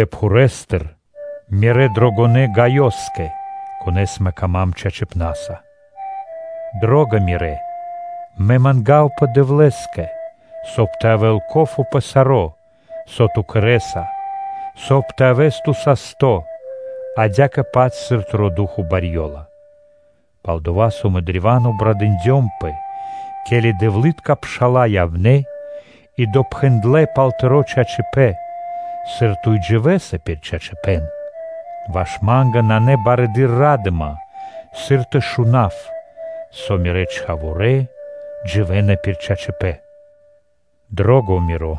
Пхурэстыр, мирэ́ дрогонэ́ Гаёскэ, кон исын дро́го ма́нгэ чачипна́са. Дро́го миро! Мэ мангавапэ Дэвлэ́скэ, соб (кай) тэ явэ́л ко́фо (польза) пэ саро́, со ту кэрэ́са, соб (кай) тэ явэс ту састо́, адя́кэ-паць сыр тыро́ ду́хо (фа́но) барьёла. Пал-дова́ со мэ древа́н обрадындёмпэ, ке́ли дэвлы́тка пша́ла явнэ́ и допхэндлэ пал тыро́ чачипэ́н, сыр ту и дживэса пир чачипэ́н. Ваш ма́нгэ нанэ барэды́р ра́дыма, сыр тэ шунав, со мирэ́ чхаворэ́ дживэ́на пир чачипэ́н. Дро́го миро!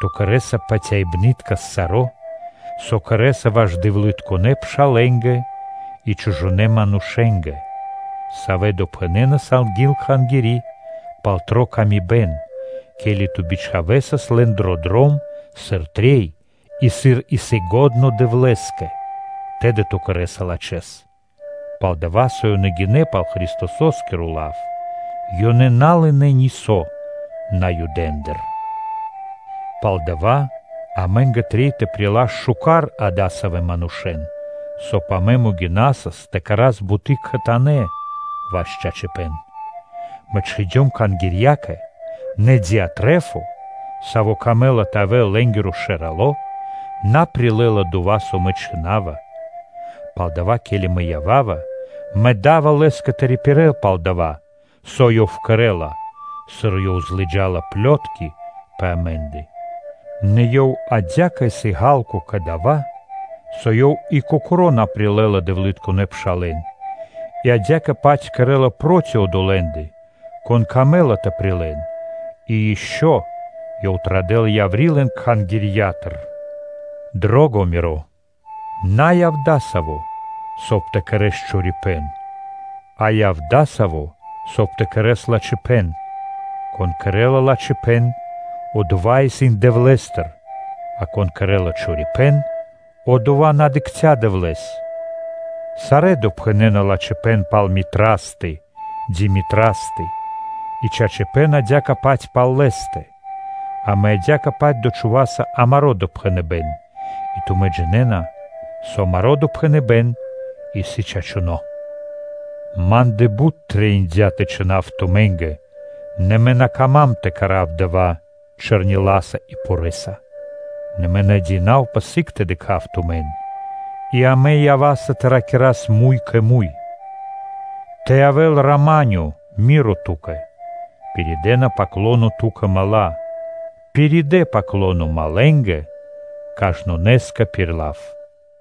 Ту кэрэ́са патяибныткэс саро́, со кэрэ́са ваш дэвлытконэ́ пшалэ́нгэ и чужонэ́ манушэ́нгэ, савэ́ допхэнэнас анги́л кхангири́ пал тыри́ пшалы́тко паты́в, ке́ли ту бичхавэсас лэн дро дром, сыр трэй и, сыр исын лачхо́ Дэвлэ́скэ, тэды ту кэрэ́са лачхэ́с; пал-дова́ со ёнэ гинэ́ пал Христосо́скиро лав, ёнэ на лынэ́ нисо́ Наюдэндыр. Палдава́ амэ́нгэ трэй тэ прилас шука́р адасавэ́ манушэ́н, соб (кай) амэ могинасас тэ кэра́с буты́ кхэтанэ́ ваш чачипэ́н. Мэ чхиндём кхангирьякэ, нэ Диатрефо, савэ́скэ явдя́ пэ годы́ тэ явэ́л лэ́нгирэ шэралэса, на прилэ́ла дова́, со мэ чхина́ва. Палдава́, ке́ли мэ ява́ва, мэ да́ва лэ́скэ тэ рипирэл пал дова́, со ёв кэрэ́ла, сыр ёв злыджала плётки пэ амэ́ндэ. Нэ ёв адя́кэ исын ґа́лко кэ дава́, со ёв и кокоро́ на прилэ́ла дэвлытконэ́ пшалэ́н, и адя́кэ-паць кэрэ́ла проти одолэ́ндэ, кон камэ́ла тэ прилэл и ишчо (инкэ́) ёв традэ́ла яври́ лэн кхангирья́тыр. Миро дро́го! На яв ту адасаво́, соб (кай) тэ кэрэ́с чорипэ́н, а яв адасаво́, соб (кай) тэ кэрэ́с лачхипэ́н. Кон кэрэ́ла лачхипэ́н, одова́ исын Дэвлэ́стыр, а кон кэрэ́ла чорипэ́н, одова́ на дыкхця́ Дэвлэ́с. Сарэ́ допхэнэна лачхипэ́н пал Дмитриёстэ (Митрастэ), и чачипэ́н адя́кэ-паць пал лэ́стэ; амэ адя́кэ-паць дочхуваса амаро́ допхэныбэ́н и тумэ́ джинэ́на, со амаро́ допхэныбэ́н исын чачуно́. Ма́ндэ бут трэиндя́ тэ чхинав тумэ́нгэ, нэ мэ на кама́м тэ кэра́в дава́ чэрниласа́ и порэ́са; нэ мэ патя́ва, со сыг мэ дыкхаво тумэн, и амэ ява́са тэ ракирас муй кэ муй. Тэ явэ́л рама́нё (миро) ту́кэ. Пиридэна “паклоно” ту́кэ мала́. Пиридэ “паклоно” малэнгэ (другэнгэ), кажнонэ́скэ пир лав. Ами́нь.